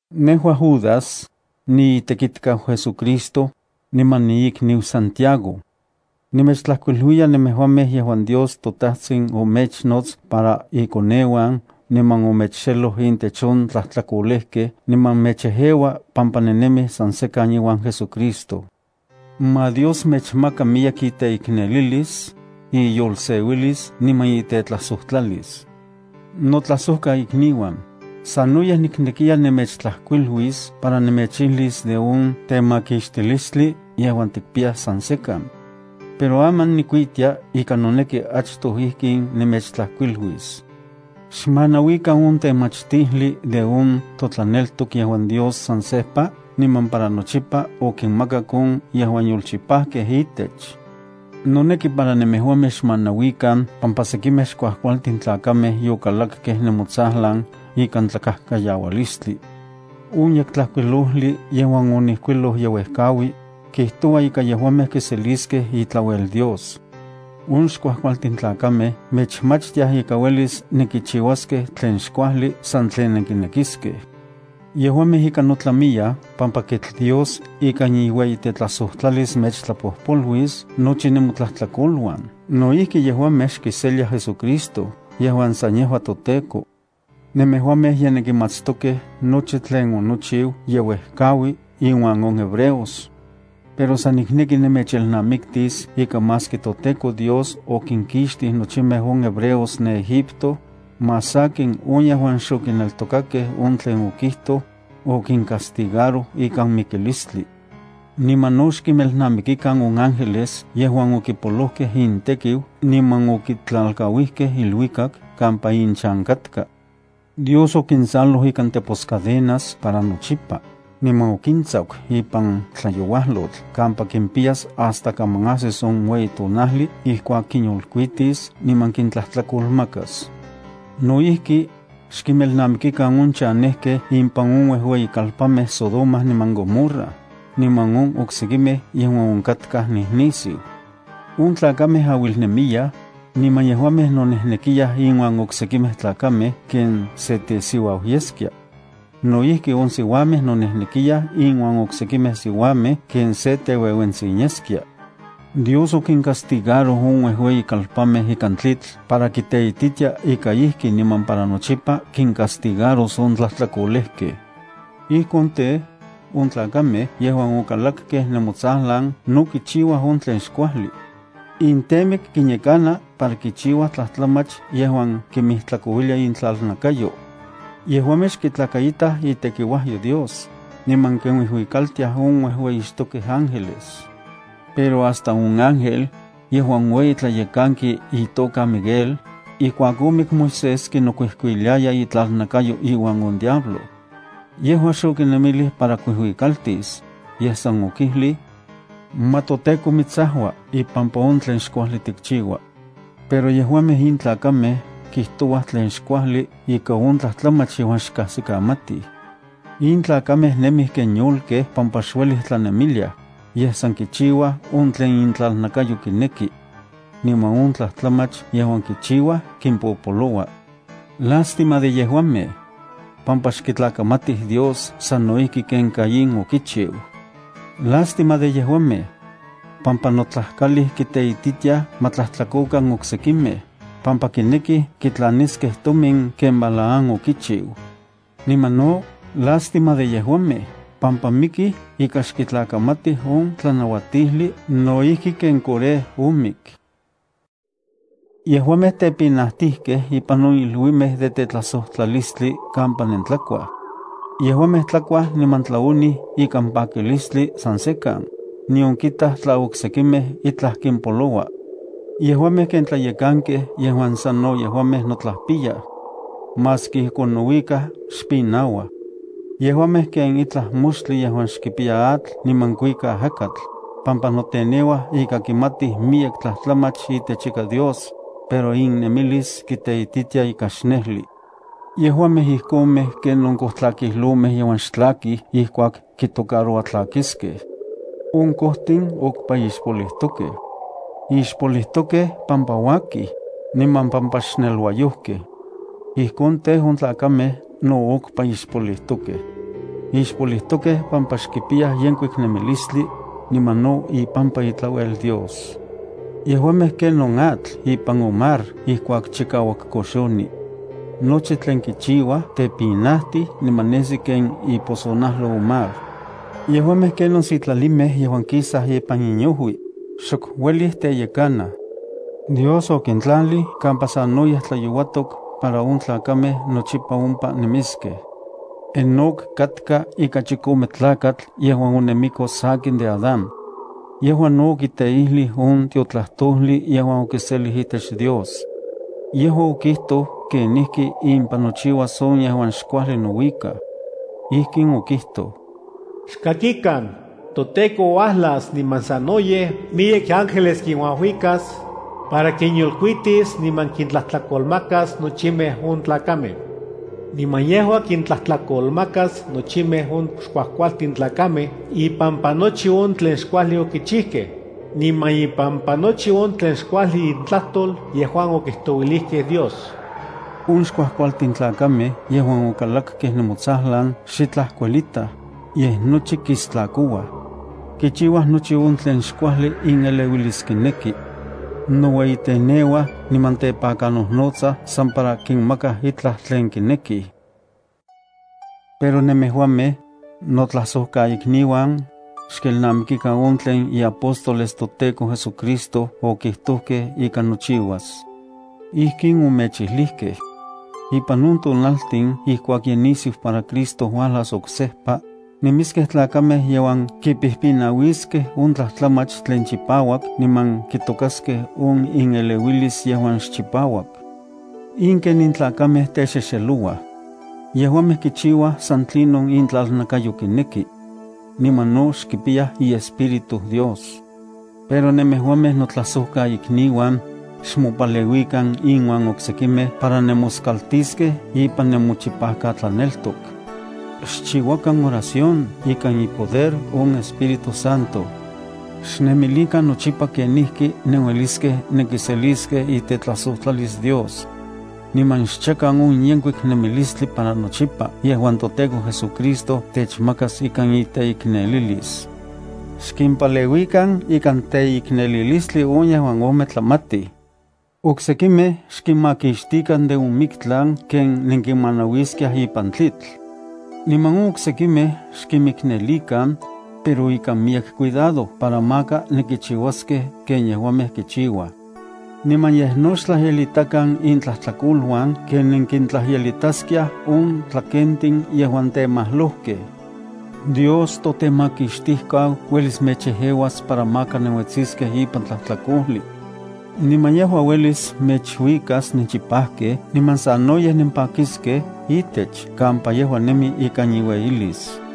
Nejua Judas, niitekitkau JesuCristo, niman niikniu Santiago. Nemechtlajkuiluiya nemejuamej yejuan Dios toTajtsin omechnots para ikoneuan niman omechxeloj intech on tlajtlakolejkej niman mechejeua pampa nennemij san sekan iuan JesuCristo. Ma Dios mechmaka miyek iteiknelilis, iyolseuilis niman itetlajsojtlalis. Notlajsojkaikniuan, sanoyej niknekiya nemechtlajkuiluis para nemechijlis de on temakixtilistli yejuan tikpiyaj san sekan. Pero aman nikuitia ika noneki achtoj ijkin nemechtlajkuiluis: “Xmanauikan on temachtijli de on totlaneltok yejuan Dios san sejpa niman para nochipa okinmakak on yejuan yolchipajkej itech.” Noneki para nemejuamej xmanauikan pampa sekimej xkuajkualtin tlakamej yokalakkej nemotsajlan ikan tlakajkayaualistli. On Yektlajkuilojli yejuan onijkuiloj ye uejkaui, kijtoua ika yejuamej kiseliskej itlauel Dios. On xkuajkualtin tlakamej mechmachtiaj ika uelis nenkichiuaskej tlen xkuajli san tlen nenkinekiskej. Yejuamej ika notlamiyaj pampa kitl Dios ikan iueyitetlajsojtlalis mechtlapojpoluis nochi nemotlajtlakoluan. No ijki yejuamej xkiseliaj JesuCristo yejuan san yejua toTEKO. Nemejuamej ye nenkimatstokej nochi tlen onochiu yeuejkaui inuan on hebreos. Pero san nikneki nemechelnamiktis ika maski toTEKO Dios okinkixtij nochimej on hebreos ne Egipto, más sakin on yejuan xokineltokakej on tlen okijtoj, okincastigaroj ikan mikilistli. Niman no xkinmelnamikikan on ángeles yejuan okipolojkej intekiu niman okitlalkauijkej iluikak kampa inchan katka. Dios okinsaloj ikan teposcadenas para nochipa, niman okintsaku ipan tlayouajlotl kampa kimpiyas hasta kaman ajsis on ueyi tonajli ijkuak kinyolkuitis niman kintlajtlakomakas. No ijki, xkinmelnamikikan on chanejkej impan on uejueyikalpanmej Sodoma niman Gomorra, niman on oksekimej yejuan onkatkaj nijnisiu. On tlakamej auilnemiyaj, niman yejuamej nonejnekiyaj inuan oksekimej tlakamej ken sen tesiuau yeskia. No ijki, on siuamej nonejnekiyaj inuan oksekimej siuamej ken sen teueuentsin yeskia. Dios okincastigaroj on uejueyikalpanmej ikan tlitl para kiteititia ika ijki niman para nochipa kincastigaros on tlajtlakolejkej. Ijkon tej, on tlakamej yejuan okalakkej nemotsajlan no kichiuaj on tlen xkuajli. Intemik kinyekana para kichiuaj tlajtlamach yejuan kimijtlakouilia intlalnakayo. Yejuamej xkitlakaitaj itekiuajyo Dios, niman kinuijuikaltiaj on uejueyixtokej ángeles. Pero hasta on ángel, yejuan ueyi tlayekanki itoka Miguel, ijkuak omik Moisés kinokuijkuiliaya itlalnakayo iuan on diablo. Yejua xokinemilij para kuijuikaltis, yej san okijlij: “Ma toTEKO mitsajua ipampa on tlen xkuajli tikchiua.” Pero yejuamej in tlakamej kijtouaj tlen xkuajli ika on tlajtlamach yejuan xkajsikamatij. In tlakamej nemij ken yolkej pampa xuelij tlanemiliaj, yej san kichiuaj on tlen intlalnakayo kineki. Niman on tlajtlamach yejuan kichiuaj kimpopoloua. ¡Lástima de yejuamej!, pampa xkitlakamatij Dios sano ijki ken Caín okichiu. ¡Lástima de yejuamej!, pampa notlajkalij kiteititiaj ma tlajtlakokan oksekimej, pampa kinekij kitlaniskej tomin ken Balaam okichiu. Niman no, ¡lástima de yejuamej!, pampa mikij ika xkitlakamatij on tlanauatijli no ijki ken Coré omik. Yejuamej tepinajtijkej ipan on iluimej de tetlajsojtlalistli kampa nentlakuaj. Yejuamej tlakuaj niman tlaonij ikan pakilistli san sekan, nion kitaj tla oksekimej itlaj kimpoloua. Yejuamej ken tlayekankej yejuan sanno yejuamej notlajpiyaj. Maski ijkon nouikaj xpinauaj. Yejuamej ken itlaj moxtli yejuan xkipiya atl niman kuika ajakatl, pampa noteneuaj ika kimatij miyek tlajtlamach itech ika Dios, pero innemilis kiteititia ika xnejli. Yejuamej ijkonmej ken on kojtlakijlomej yejuan xtlakij ijkuak kitocaroua tlakiskej. On kojtin okpa ixpolijtokej. Ixpolijtokej pampa uakij, niman pampa xneluayojkej. Ijkon tej, on tlakamej no okpa ixpolijtokej. Ixpolijtokej pampa xkipiyaj yenkuik nemilistli, niman no ipampa itlauel Dios. Yejuamej ken on atl ipan on mar ijkuak chikauak koxoni. Nochi tlen kichiuaj tepinajtij niman nesi ken iposonajlo on mar. Yejuamej kenon sitlalimej yejuan kisaj ipan inojui, xok uelij teyekanaj. Dios okitlalij kampa sanoyej tlayouatok para on tlakamej nochipa ompa nemiskej. Enoc katka ika chikome tlakatl yejuan onemiko sakin de Adán. Yejua no okiteijlij on tiotlajtojli yejuan okiselij itech Dios. Yejua okijtoj kenijki impan nochiuas on yejuan xkuajli nouikaj. Ijkin okijtoj: “Xkakikan, toTEKO uajlas niman sanoyej miyek ángeles kinuajuikas, para kinyolkuitis niman kintlajtlakolmakas nochimej on tlakamej. Niman yejua kintlajtlakolmakas nochimej on xkuajkualtin tlakamej ipampa nochi on tlen xkuajli okichijkej, niman ipampa nochi on tlen xkuajli intlajtol yejuan okijtouilijkej Dios.” On xkuajkualtin tlakamej yejuan okalakkej nemotsajlan xitlaj kuelitaj, yej nochi kistlakouaj. Kichiuaj nochi on tlen xkuajli ineleuilis kineki. Noueyiteneuaj niman tepakanojnotsaj san para kinmakaj itlaj tlen kinekij. Pero nemejuamej, notlajsojkaikniuan, xkelnamikikan on tlen iapóstoles toTEKO JesuCristo okijtojkej ika nochiuas. Ijkin omechijlijkej: “Ipan on tonaltin ijkuak ye nisiu para Cristo uajlas oksejpa, nemiskej tlakamej yejuan kipijpinauiskej on tlajtlamach tlen chipauak niman kitokaskej on ineleuilis yejuan xchipauak.” In ken in tlakamej texexelouaj. Yejuamej kichiuaj san tlinon intlalnakayo kineki. Niman no xkipiyaj iEspíritu Dios. Pero nemejuamej, notlajsojkaikniuan, xmopaleuikan inuan oksekimej para nemoskaltiskej ipan nemochipajkatlaneltok. Xchiuakan oración ikan ipoder on Espíritu Santo. Xnemilikan nochipa kenijki nenueliskej nenkiseliskej itetlajsojtlalis Dios. Niman xchakan on yenkuik nemilistli para nochipa yejuan toTEKO JesuCristo techmakas ikan iteiknelilis. Xkimpaleuikan ikan teiknelilistli on yejuan ometlamatij. Oksekimej xkinmakixtikan de on miktlan ken nenkinmanauiskiaj ipan tlitl. Niman on oksekimej xkinmiknelikan, pero ikan miyek cuidado para maka nenkichiuaskej ken yejuamej kichiuaj. Niman yej no xtlajyelitakan intlajtlakoluan ken nenkintlajyelitaskiaj on tlakentin yejuan temajlojkej. Dios toTemakixtijkau uelis mechejeuas para maka nenuetsiskej ipan tlajtlakojli. Niman yejua uelis mechuikas nenchipajkej niman sanoyej nempakiskej itech kampa yejua nemi ikan iueyilis.